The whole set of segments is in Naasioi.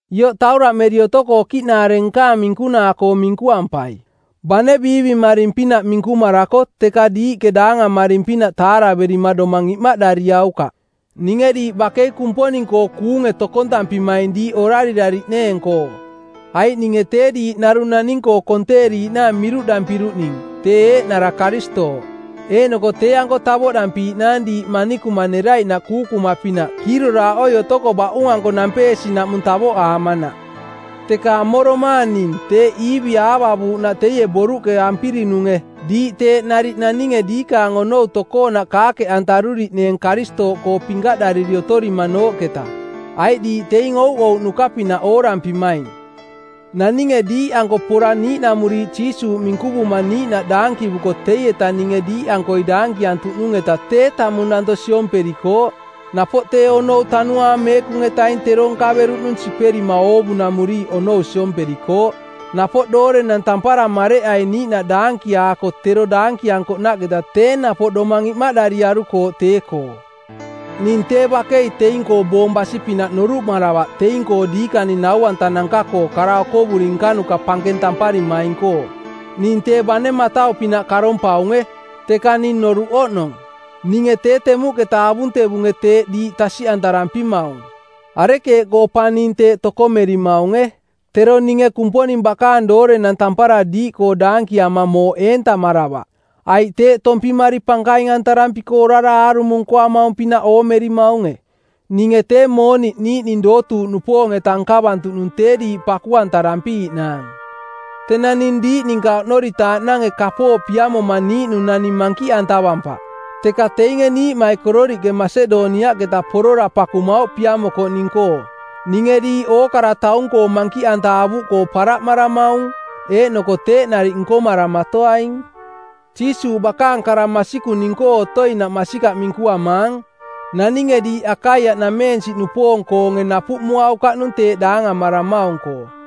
Ioꞌ tauraꞌmeri otoko okiꞌnanaare nkaang minkunaa-koo minkuampai. Bane biivimaring-pinaꞌ minkumarako teka diiꞌke daangamaring-pinaꞌ taaraverima domang imaꞌdariaukaꞌ. Ninge diiꞌ bakei Kumponing-koo kuunge tokontampimaing diiꞌ orarirariꞌneeng-koo. Aiꞌ ninge tee diiꞌ narung naning-koo konteeriiꞌnaang miruꞌdampiruꞌning tee eeꞌnara Karistooꞌ. Eeꞌnoko tee-anko tavoꞌdampiiꞌnaang diiꞌ manikuma neraiꞌnaꞌ kuukuma˜pinaꞌ kiiroraaꞌoi otoko baꞌung-anko nampeesinaꞌmung taavoꞌaamanaꞌ. Teka amoromaang ning teeꞌ Iivi aavavuuꞌnaꞌ teie boruꞌke ampirinunge˜ diiꞌ teeꞌ nariꞌ naninge diikaang onou tokoonaꞌ kaakeꞌantaruriꞌneeng Karistooꞌkoo pinkaꞌdariri otorimanooꞌketa. Aiꞌ diiꞌ teing ouꞌouꞌnuka-pinaꞌ oorampimaing. Naninge diiꞌanko pora niiꞌnamuriiꞌ Jiisuuꞌ minkuvuma niiꞌnaꞌ daankivuko teietaꞌ ninge diiꞌankoi daankiantuꞌnung-eta tee tamung danto siomperikooꞌ. Napoꞌ tee onou Tanuaang Meekung-etaing tero nkaveruꞌnung siperima oovunamuriiꞌ onou siomperikooꞌ. Napoꞌ doorenang tampara mareꞌai niiꞌnaꞌ daankiaako tero daankiankoꞌnaꞌketa tee napoꞌ domang imaꞌdariarukooꞌ tee-koo. Ning tee bakei teing-koo boong basi-pinaꞌ noruꞌmaravaꞌ teing-koo diikaning nau-antanuka-koo kara okovuri nkanuka pankeng tamparimaing-koo. Ning tee bane matau-pinaꞌ karompaunge, teka ning noruꞌ oꞌnong. Ninge tee temuꞌketa avuntevunge teeꞌ diiꞌ tasiꞌantarampimaung. Arekeeꞌkoo pa ning teeꞌ tokomerimaunge? Tero ninge Kumponing bakaang doorenang tampara diiꞌkoo daankiama mooꞌ eentamaravaꞌ. Aiꞌ teeꞌ tompimari pankaing-antarampiko orara aarumo nkoamaung-pinaꞌ oomerimaunge? Ninge tee mooniꞌ niiꞌning dootuuꞌnupoong-eta nkavantuꞌnung tee diiꞌ paku-antarampiiꞌnaang. Tenang ning diiꞌ ninka oꞌnoritaaꞌnange kapooꞌ piamoma niiꞌnung naning mankiꞌantavampaꞌ, teka teinge niiꞌmaikororiꞌke Masedoniaꞌketa porora pakumauꞌ piamokoꞌning-koo. Ninge diiꞌ ookara taung-koo mankiꞌanta avuꞌkoo paraꞌmaramaung, eeꞌnoko teeꞌ nariꞌ nkomaramatoaing. Jiisuuꞌ bakaang kara masikung ning-koo otoinaꞌ masikaꞌ minkuamaang, naninge diiꞌ Akaiaꞌnameensiꞌnupoong-koonge napuꞌmuaukaꞌnung teeꞌ daangamaramaung-koo.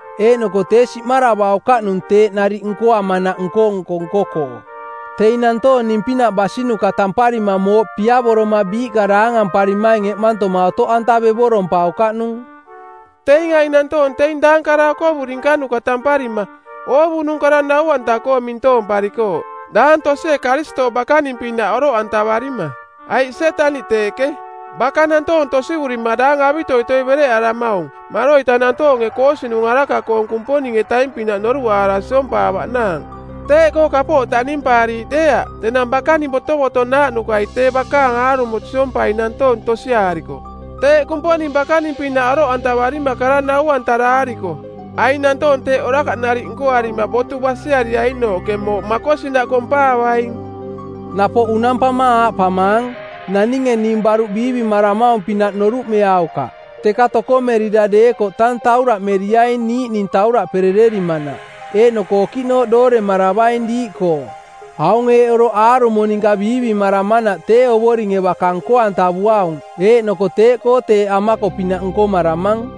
Eeꞌnoko tee siꞌmaravaukaꞌnung teeꞌ nariꞌ nkoamanaꞌ nko-nko nko-koo. Teing nantoong ning-pinaꞌ basinuka tamparima mooꞌ piavoroma biiꞌka daangamparimaing eꞌmantoma otoꞌantavevorompaukaꞌnung. Teing aing nantoong teing daang kara okovuri nkanuka tamparima, oovunung kara nau-anta-koo mintoomparikooꞌ, daang tosie Karistooꞌ bakaning-pinaꞌ oroꞌantavarima. Aiꞌ Sietaniꞌ teeꞌke, baka nantoong tosivurima daang avitoitoi bereꞌaramaung maroita nantoonge koosinung˜ araka-koong Kumponing-etaing-pinaꞌ noruꞌaara siompaavaꞌnaang. Teeꞌkoo kapooꞌ taꞌnimpaariiꞌ deeaꞌ tenang bakaning botovotonaaꞌnukai tee bakaang aarumo siompai nantoong tosiaariko, teeꞌ Kumponing bakaning-pinaꞌ oroꞌantavarima kara nau-antaraariko. Aing nantoong teeꞌ orakaꞌ nariꞌ nkoarima botu basiariainooꞌke mooꞌ makosinaꞌ kompaavaing. Napoꞌ unampama aaꞌpamaang, naninge ning baruꞌ biivimaramaung-pinaꞌ noruꞌmeaukaꞌ, teka tokomerira deekoꞌ tang tauraꞌmeriaing niiꞌning tauraꞌperererimanaꞌ, eeꞌnoko okiꞌnooꞌ dooremaravaing diiꞌkoo. Aung eeꞌ oroꞌ aarumo ninka biivimaramanaꞌ tee Ovoringe baka nko-antavuaung eeꞌnoko teeꞌkoo teeꞌ amako-pinaꞌ nkomaramang.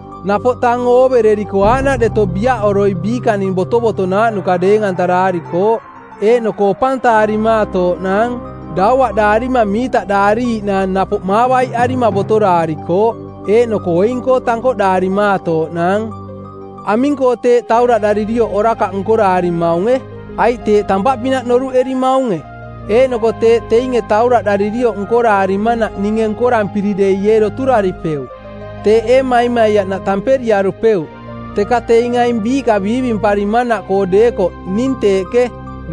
Napoꞌ tang ooveri otoriko aaꞌnaꞌ deto biaꞌoroi biikaning botovotonaaꞌnuka deeng-antaraarikooꞌ, eeꞌnoko opantaarimaatooꞌnaang. Dauaꞌdaarima miitaꞌdaariiꞌnaang, napoꞌ maavaiꞌarima botoraarikooꞌ. Eeꞌnoko oing-koo tankoꞌdaarimaatooꞌnaang. Aming-koo teeꞌ tauraꞌdaririoꞌ orakaꞌ nkoraarimaunge? Aiꞌ teeꞌ tampaꞌpinaꞌ noruꞌerimaunge? Eeꞌnoko teeꞌ teinge tauraꞌdaririoꞌ nkoraarimanaꞌ ninge nkorampiri dei ee doturaripeuꞌ? Teeꞌ ee maimaiaꞌnaꞌ tamperiarupeuꞌ? Teka teing aing biiꞌka biivimparimanaꞌkoo deekoꞌ ning teeꞌke,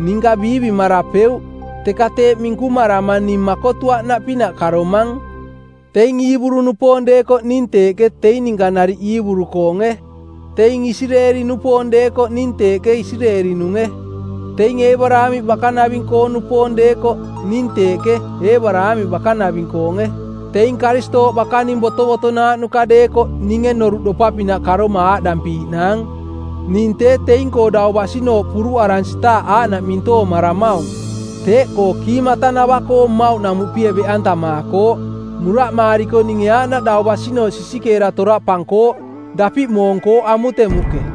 ninka biivimarapeuꞌ, teka teeꞌ minkumarama ning makotuaꞌnaꞌpinaꞌ karomang. Teing Iiburu-nupoong deekoꞌ ning teeꞌke teing ninka nariꞌ Iiburu-koonge. Teing Isireeli-nupoong deekoꞌ ning teeꞌke Isireeli-nunge. Teing Eebaraamiꞌ bakanaving-koo-nupoong deekoꞌ, ning teeꞌke, Eebaraamiꞌ bakanaving-koonge. Teing Karistooꞌ bakaning botovotonaaꞌnuka deekoꞌ ninge noruꞌdopa-pinaꞌ karoma aaꞌdampiiꞌnaang: Ning tee teing-koo dau basinooꞌ puruꞌaransitaaꞌ aaꞌnaꞌ mintoomaramaung. Teeꞌkoo kiimatanava-koo mmauꞌnamuꞌpie beꞌantamaakooꞌ; muraꞌmaariko ninge aaꞌnaꞌ dau basinooꞌ sisikeera toraꞌpankooꞌ; dapiꞌ moonkooꞌ amutemuꞌke.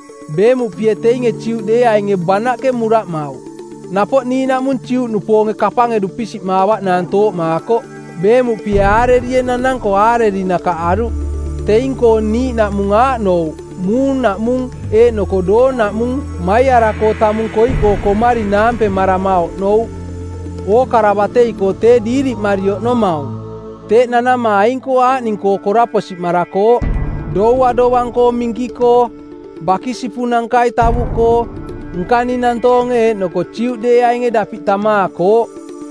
Beemuꞌpie teinge Juꞌdeeainge banaꞌke muraꞌmauꞌ. Napoꞌ niiꞌnaꞌmung Juꞌnupoonge kapange dupisiꞌmaavaꞌnaang tooꞌmaakoꞌ. Beemuꞌpie aarerie˜ nananko aareri nakaꞌaruꞌ. Teing-koo niiꞌnaꞌmung aaꞌnouꞌ muung naꞌmung eeꞌnoko doong naꞌmung maiaraꞌkoo tamung koiꞌkoo komari naampemarama oꞌnouꞌ. Ookara batei-koo tee diiriꞌmari oꞌnomaung. Teeꞌ nanama aing aaꞌning-koo koraposimarakooꞌ: doua dovang-koo minki-koo, bakisipunankai tavuꞌkoo, nkaning nantoonge eeꞌnoko Juꞌdeeainge dapiꞌ tamaakooꞌ,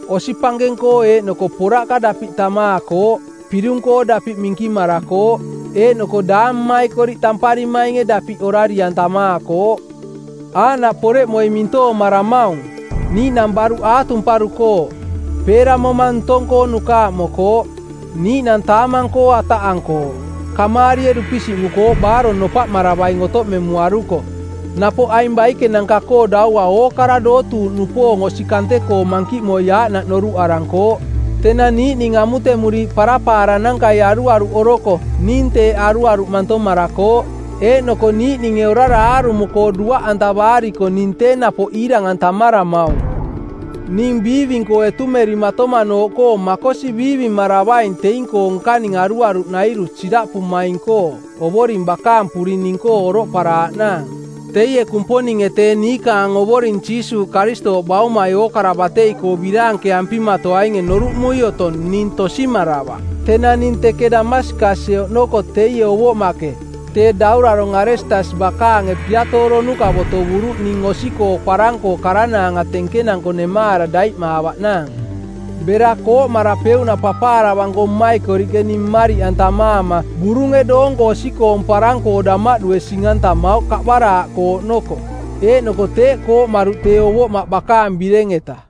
osi pankeng-koo eeꞌnoko poraꞌka dapiꞌ tamaakooꞌ. Pirung-koo dapiꞌ minkimarakooꞌ, eeꞌnoko daang mmaikoriꞌ tamparimainge dapiꞌ orari-antamaakooꞌ. Aaꞌnaꞌ poreꞌmoi mintoomaramaung. Niiꞌnang baruꞌ aatumparukooꞌ. Peeramoma ntong-koo nukaaꞌmokooꞌ. Niiꞌnang taamang-koo ataꞌankooꞌ. Kamaarie dupisiꞌmukooꞌ baarong nopaꞌmaravaing otoꞌmemuaruko. Napoꞌ aing baikenanka-koo daua ookara dootuuꞌnupoong osi kante-koo mankiꞌmoi aaꞌnaꞌ noruꞌarankooꞌ. Tenang niiꞌning amutemuriiꞌ parapaaranankai aruaruꞌoroko ning teeꞌ aruaruꞌ mantomarakooꞌ. Eeꞌnoko niiꞌninge orara aarumo-koo duaꞌantavaariko ning tee napoꞌ iirang-antamaramaung. Ning biiving-koo etumerimatomanooꞌkoo makosi biivimaravaing teing-koo nkaning aruaruꞌnairu siraꞌpumaing-koo Ovoring bakaang puring ning-koo oroꞌparaaꞌnaang. Teie Kumponinge tee niikaang Ovoring Jiisuuꞌ Karistooꞌ Baumai ookara batei-koo biraankeampimaatoainge noruꞌmui otong ning tosimaravaꞌ. Tenang ning teke Damaskasie oꞌnoko teie ovoꞌmaꞌke, tee daurarong˜ Aretasi bakaange piatooronuka˜ botovuruꞌ ning osi-koo parang-koo karanaanga tenkenanko nemaara daiꞌmaavaꞌnaang. Bera kooꞌmarapeuꞌnaꞌ papaaravanko mmaikoriꞌke ning mmariꞌantamaama burunge doonko osi-koong parang-koo damaꞌdue sing-antamauꞌ kaꞌbaraaꞌkoo oꞌnoko. Eeꞌnoko teeꞌ kooꞌmaruꞌ tee ovoꞌmaꞌ bakaang bireng-eta.